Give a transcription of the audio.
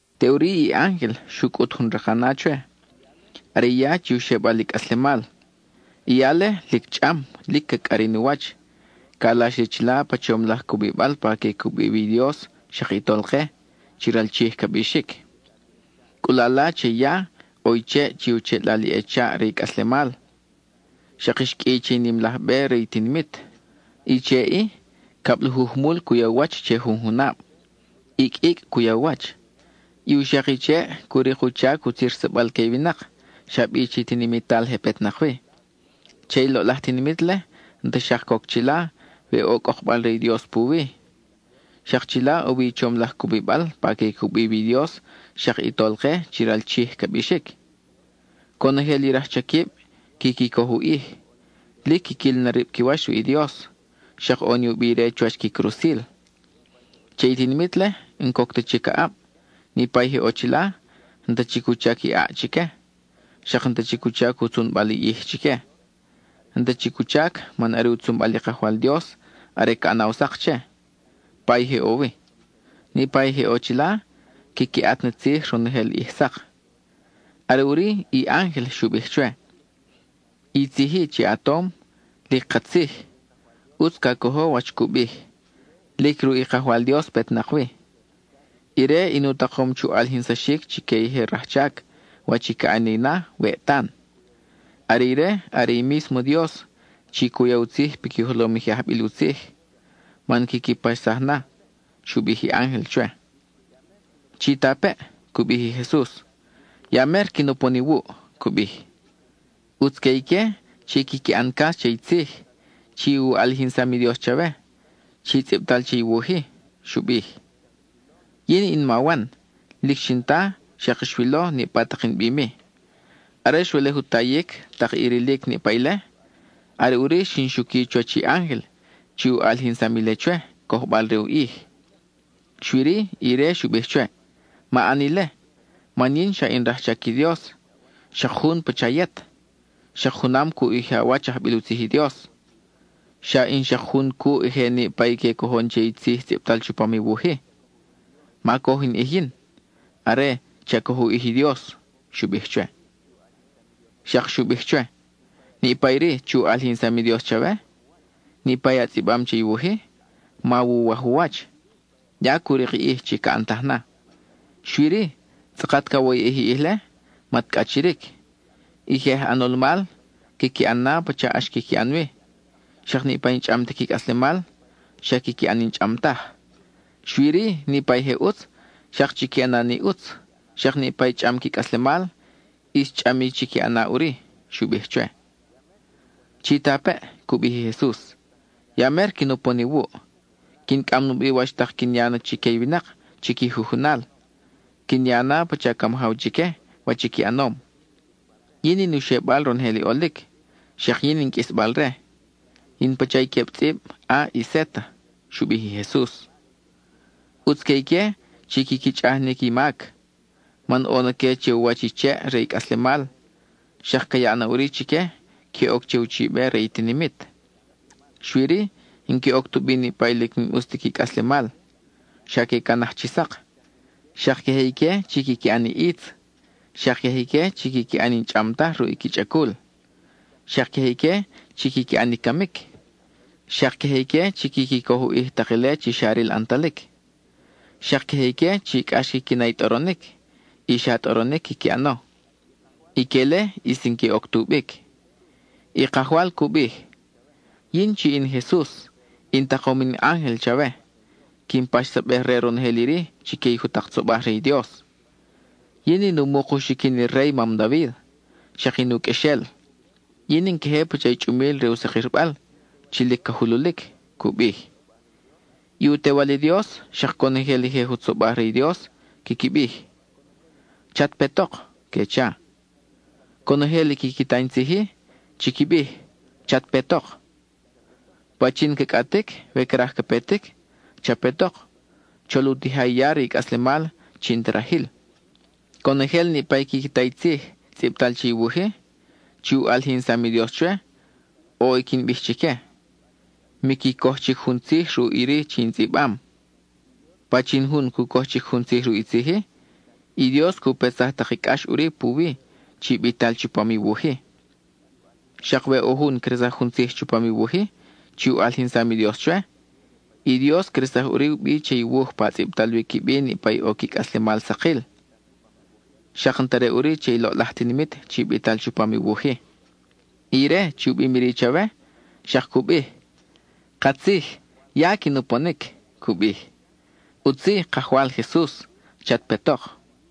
Teʼuri i ángel xu cʼut jun rakana chwe; are i ya chi u xebal i cʼaslemal. I ya-le, lic chʼam, lic ca cʼarin u wach; calax li chila pa chom laj cubibal pa que cubi wi i Dios xak i Tolke, chi ral Chij ca bixic. Cʼulala che i ya, ʼo i cheʼ chi u cheʼlal i echaʼ re i cʼaslemal; xak xqʼuiy che i nim laj be re i tinimit. I cheʼ-i, cablajuj mul cu ya u wach che jun junab; icʼ icʼ cu ya u wach. I u xak i cheʼ cu rik u chac utzirsabal que i winak, xa bi chi tinimital je petnak wi. Che i loʼlaj tinimit-le, n-ta xak coc chila we ʼo cʼokbal re i Dios puwi. Xak chila ʼo wi i chom laj cubibal pa que cubi wi i Dios xak i Tolke chi ral Chij ca bixic. Conojel i rajchaquib quiqui coj u ʼij. Lic quiquil na rib qui wach ruʼ i Dios, xak ʼo ni u bi ire chuwach qui crusil. Che i tinimit-le, n-coc ta chic aʼab; niʼpa i je ʼo chila, n-ta chic u chac i ʼaʼ chique, xak n-ta chic u chac u tzunbal i ʼij chique. N-ta chic u chac, man are u tzunbal i Kajwal Dios are ca ʼanaw sak che, pa i je ʼo wi. Niʼpa i je ʼo chila quiqui ʼat ni tzij ronojel ʼij sak. Are ʼuri, i ángel xu bij chwe: —I tzij-i chi a tom, lic katzij, ʼutz ca cojo wach cu bij; lic ruʼ i Kajwal Dios petnak wi. Ire in u takom chu ʼalijinsaxic chique i je rajchac, wach i ca ʼani na, weʼ tan. Are ire, are i mísmo Dios chi cu ya u tzij piqui jolom i je ajbil u tzij, man quiqui paxsaj na —xu bij i ángel chwe. —Chitapeʼ —cu bij i Jesus—, ¡ya mer quin upon iwuʼ! —cu bij. ʼUtz que ique chi quiqui ʼan cas che i tzij chi u ʼalijinsam i Dios chawe, chi tzʼibtal che i wuj-i —xu bij. Yin in ma Wan, lic xin ta, xak xwilo, niʼpa tak in bim-i. Are xwelej u tayic, tak i rilic niʼpa ile, are ʼuri xin xuqui chuwach i ángel chi u ʼalijinsam ile chwe, cojbal re u ʼij. Xui-ri, ire xu bij chwe: —Ma ʼan ile, man yin xa in rajchac i Dios, xak jun pacha yet, xak junam cuʼ i je awach ajbil u tzij i Dios; xa in xak jun cuʼ je niʼpa i que cojon che i tzij tzʼibtal chupam i wuj-i. Ma coj in ʼij yin; are, cha cojo u ʼij i Dios —xu bij chwe. Xak xu bij chwe: —Niʼpa iri chi u ʼalijinsam i Dios chawe, niʼpa a tzʼibam che i wuj-i, mawuwaj u wach; ya cu rik i ʼij chi ca ʼantaj na. Xui-ri, tzʼakat cawoyʼej i ʼij-le mat cʼachiric, i je aj ʼanol mal, quiqui ʼan na pacha ʼax quiqui ʼan wi; xak niʼpa i n-chʼam ti qui cʼaslemal, xa quiqui ʼan i n-chʼam taj. Xak niʼpa i je ʼutz, xak chiqui ʼana ni ʼutz, xak niʼpa i chʼam qui cʼaslemal, ʼis chʼam i chiqui ʼana ʼuri —xu bij chwe. —Chitapeʼ —cu bij i Jesus—, ¡ya mer quin upon iwuʼ! Quin cʼam nubi wach tak quin ya na chique i winak chi qui jujunal; quin ya na pacha ca majaw chique, wach i qui ʼanom. Yin in u xebal ronojel i ʼolic, xak yin in qʼuisbal-re; in pacha i queb tzʼib A y Z —xu bij i Jesus. ʼUtz que ique chi quiqui chʼaj ni qui mac; man ʼo na que che u wach i cheʼ re i cʼaslemal; xak ca yaʼ na ʼuri chique, que oc che uchibe re i tinimit. Xui-ri, n-que oc tubi niʼpa i lic n-ʼus ti qui cʼaslemal; xa que canaj chi sak; xak queje ique chi quiqui ʼan i ʼitz, xak queje ique chi quiqui ʼan i n-chʼam taj ruʼ qui chʼacul; xak queje ique chi quiqui ʼan i camic; xak queje ique chi quiqui coj u ʼij tak ile chi xa ril ʼantalic; xak queje ique chi cʼax quiqui na i tʼoronic, y xa tʼoronic quiqui ʼano. Ique-le ʼis n-que oc tubic. I Kajwal cu bij: —Yin, chi in Jesus, in takom in ángel chawe, quin paxsabej re ronojel iri chique i jutak tzobaj re i Dios. Yin in u muk u xiquin i rey mam David; xak in u qʼuexel. Yin in queje pacha i chʼumil re u sakirbal chi lic ca jululic —cu bij. I u Tewal i Dios, xak conojel i je jutzobaj re i Dios, quiqui bij: —¡Chat petok! —que cha. Conojel i quiqui ta in tzij-i, chiqui bij: —¡Chat petok! Pachin ca cʼatic, we craj ca petic, cha petok, chol u tija i ya re i cʼaslemal chi n-ta rajil. Conojel niʼpa i quiqui ta i tzij tzʼibtal che i wuj-i, chi u ʼalijinsam i Dios chwe, ʼo i quin bij chique: miqui coj chic jun tzij ruʼ iri chi in tzʼibam. Pachin jun cu coj chic jun tzij ruʼ i tzij-i, i Dios cu petsaj tak i cʼax ʼuri puwi, chi bital chupam i wuj-i. Xak we ʼo jun cresaj jun tzij chupam i wuj-i chi u ʼalijinsam i Dios chwe, i Dios cresaj ʼuri u bi che i wuj pa tzʼibtal wi qui bi niʼpa i ʼo qui cʼaslemal sakil, xak n-ta re ʼuri che i loʼlaj tinimit chi bital chupam i wuj-i. Ire chi u bim iri chwe, xak cu bij: —Katzij, ¡ya quin uponic! —cu bij. ʼUtz-i, Kajwal Jesus. ¡Chat petok!